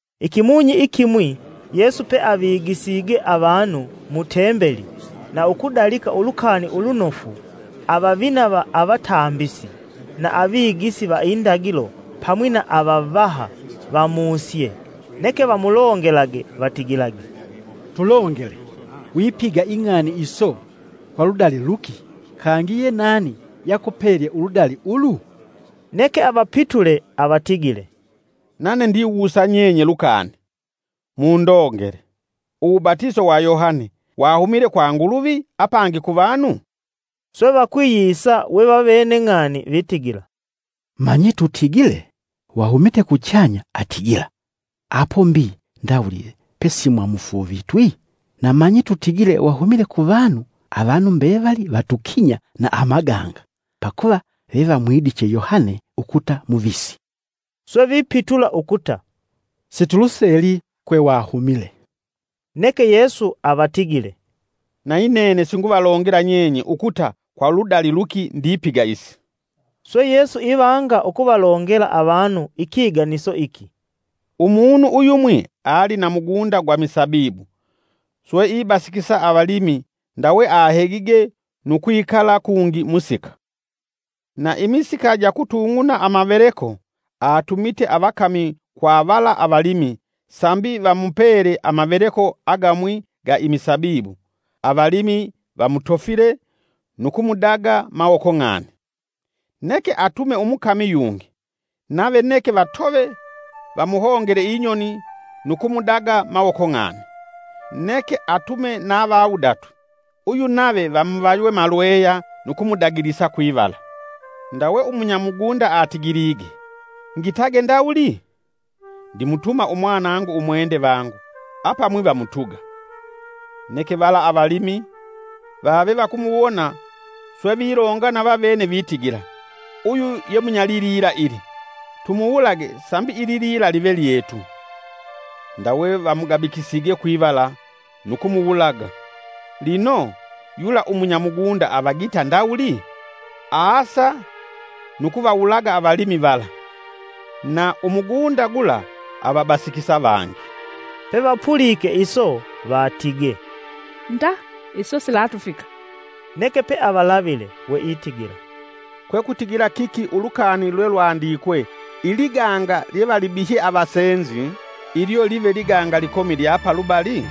Ikimunyi ikimwi, Yesu peavigisige avanu mu tembeli na ukudalika ulukani ulunofu, avavina va avatambisi, na avigisi va indagilo pamwi na avavaha, vamusye, Neke vamulongelage vatigilage, “Tulongele! Wipiga ing'ani iso kwa ludali luki, kangi yenani yakupelye uludali ulu?” Neke avapitule avatigile, “Nane ndivawusa nyenye lukani, mundogele: uwubatiso wa Yohane wahumile kwa Nguluvi apangi kuvanu?” Swe vakwiyisa we vavene ng'ani vitigila: “Manyi tutigile wahumite kuchanya, atigila: ‘Apo mbi ndawuli pe simwamufuuvitwi?’ Na manyi tutigile wahumile ku vanu, avanu mbevali vatukinya na amaganga, pakuva vevamwidiche Yohane ukuta muvisi.” Swe vipitula ukuta, “Situluseli kwe wahumile.” Neke Yesu avatigile, “Nayinene singuvalongela nyenye ukuta kwa ludali luki ndipiga isi.” Swe Yesu ivanga ukuvalongela avanu ikiganiso iki, “Umunu uyumwi ali na mugunda gwa misabibu, swe ibasikisa avalimi ndawe ahegige nu kwikala kungi musika. Na imisika ja kutung'una amaveleko, atumite avakami kwa vala avalimi sambi vamupele amaveleko agamwi ga imisabibu. Avalimi vamutofile nu kumudaga mawoko ng'ani. Neke atume umukami yungi; nave neke vatove vamuhongele inyoni nu kumudaga mawoko ng'ani. Neke atume na vawudatu, uyu nave vamuvaywe malweya nu kumudagilisa kwivala. Ndawe umunyamugunda atigilige: ‘Ngitage ndawuli? Ndimutuma umwanangu umwende vangu; apamwi vamutuga.’ Neke vala avalimi, vave vakumuwona swe vilongana vavene vitigila: ‘Uyu ye munyalilila ili. Tumuwulage sambi ililila live lyetu.’ Ndawe vamugabikisige kwivala nu kumuwulaga.” Lino, Yula umunyamungunda avagita ndawuli? Aasa nu kuvawulaga avalimi vala, na umugunda gula avabasikisa vangi, pevapulike iso vatige, “Nda iso silatufika!” Neke pe avalavile we itigila, “Kwe kutigila kiki ulukani lwe lwandikwe ‘Iliganga lyevalibihye avasenzi, ilyo live liganga likomi lya palubali?’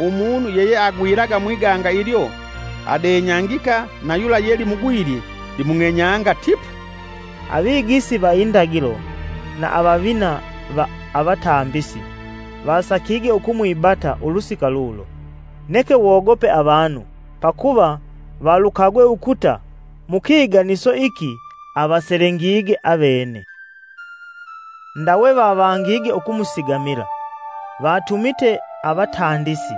Umunu yeyeagwilaga mwiganga ilyo adenyangika na yula ye limugwilye limung'enyanga tipu!” Avigisi va indagilo, na avavina va avatambisi vasakige ukumwibata ulusika lulo, neke wogope avanu pakuva valukagwe ukuta mukiganiso iki avaselengige avene. Ndawe vavangige ukumusigamila. Vatumite avatandisi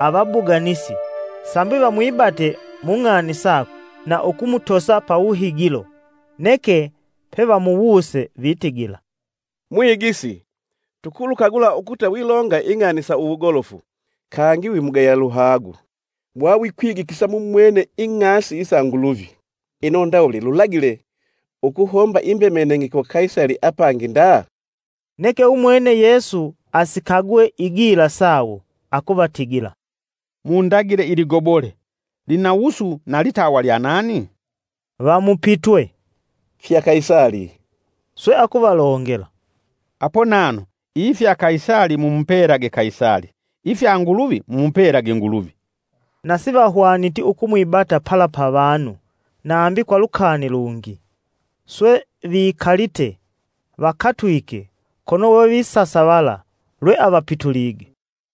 avabuganisi sambi vamwibate mung'ani sakwe na ukumutosa pa wuhigilo. Neke pevamuwuse vitigila, “Mwigisi, tukulukagula ukuta wilonga ing'ani sa uwugolofu, kangi wimugaya luhagu wawikwigikisa mumwene ing'asi isa Nguluvi. Ino ndawuli lulagile, ukuhomba imbemenenge kwa Kaisali apangi nda!” Neke umwene Yesu asikagwe igila sawo akuvatigila, “Mundagile iligobole. Lina wusu na litawa lya nani?” Vamupitwe, “Fya Kaisali.” Swe akuvalongela, “Apo nano, ifya Kaisali mumupelage Kaisali, ifya Nguluvi mumupelage Nguluvi.” Na sivahwaniti ukumwibata pala pa vanu nambi kwa lukani lungi, swe vikalite vakatwike kono we visasavala lwe avapitulige.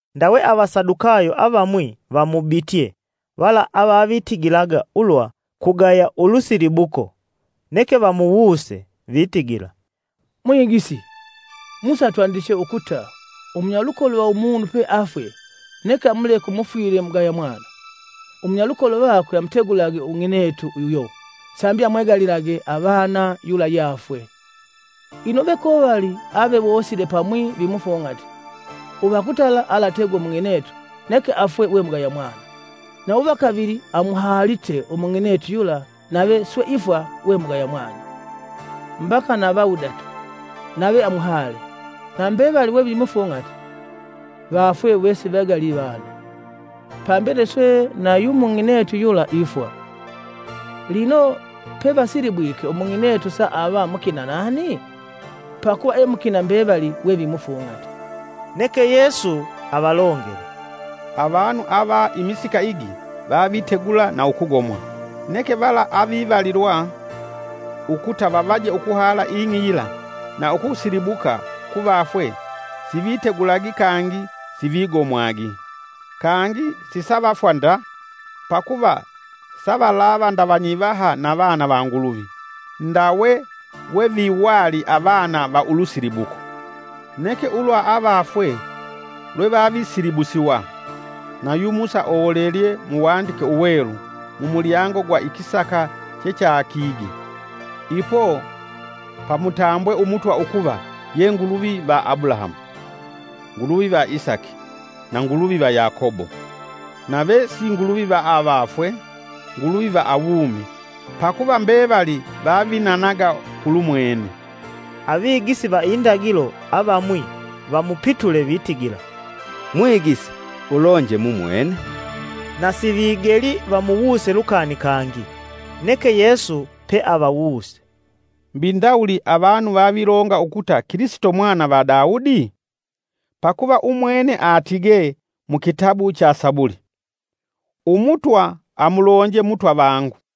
Ndawe Avasadukayo, avamwi vamubitye vala avavitigilaga ulwa kugaya ulusilibuko, neke vamuwuse: vitigila, “Mwigisi, Musa atwandiche ukuta umunyalukolo va umunu peafwe neke amuleke umufwile mugaya mwana, umunyalukolo vakwe amutegulage ung'inetu uyo sambi amwegalilage avana yula yeafwe. Ino vekovali avewosile pamwi vimufung'ati. Uvakutala alategwe umung'inetu neke afwe we mugaya mwana. Na uva kavili amuhalite umung'inetu yula nave swe ifwa we mugaya mwana; mbaka na vawudatu nave amuhale. Na mbevali we vimufung'ati, vafwe wesivegali vana. Pambele swe nayu mung'inetu yula ifwa. Lino, pevasilibwike umung'inetu saava mukina nani? Pakuva e mukina mbevali we vimufung'ati.” Neke Yesu avalongele, “Avanu ava imisika igi vavitegula na ukugomwa; Neke vala avivalilwa ukuta vavaje ukuhala ing'i yila na ukusilibuka kuvafwe sivitegulagi kangi sivigomwagi. Kangi sisavafwa nda, pakuva savalava nda vanyivaha na vana va Nguluvi, ndawe weviwali avana va ulusilibuko. Neke ulwa avafwe lwevavisilibusiwa, na yu Musa olelye Muwandike Uwelu mumulyango gwa ikisaka chechakige, ipo pamutambwe Umutwa ukuva ye Nguluvi va Abulahamu, Nguluvi va Isaki, na Nguluvi va Yakobo. Nave si Nguluvi va avafwe, Nguluvi va awumi, pakuva mbevali vavinanaga kulumwene.” Avigisi va Indagilo avamwi vamupitule vitigila, “Mwigisi ulonje mumwene.” Na sivigeli vamuwuse lukani kangi. Neke Yesu peavawuse, “Mbi ndawuli avanu vavilonga ukuta Kilisito mwana va Daudi? Pakuva umwene atigee mu kitabu cha Sabuli: ‘Umutwa amulonje Mutwa vangu: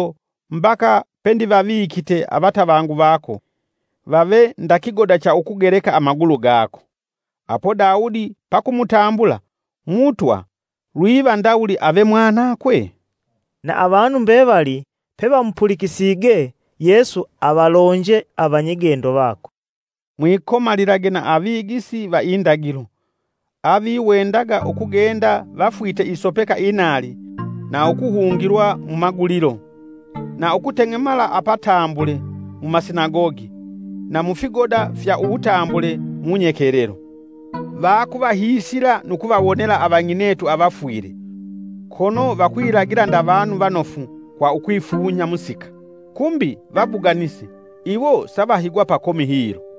mbaka pe ndivavikite avatavangu vako vave nda kigoda cha ukugeleka amagulu gako.’ Apo Daudi pakumutambula, ‘Mutwa,’ lwiva ndawuli ave mwanakwe?” Na avanu mbevali pevamupulikisige, Yesu avalonje avigendo vakwe, “Mwikomalilage na avigisi va Indagilo, aviwendaga ukugenda vafwite isopeka inaali na ukuhungilwa mumagulilo, na ukuteng'emala apatambule mumasinagogi na mufigoda fya uwutambule munyekelelo. Vakuvahiisila nu kuvawonela avang'inetu avafwile, kono vakwilagila nda vanu vanofu kwa ukwifunya musika kumbi vabuganisi. Iwo savahigwa pakomi hilo!”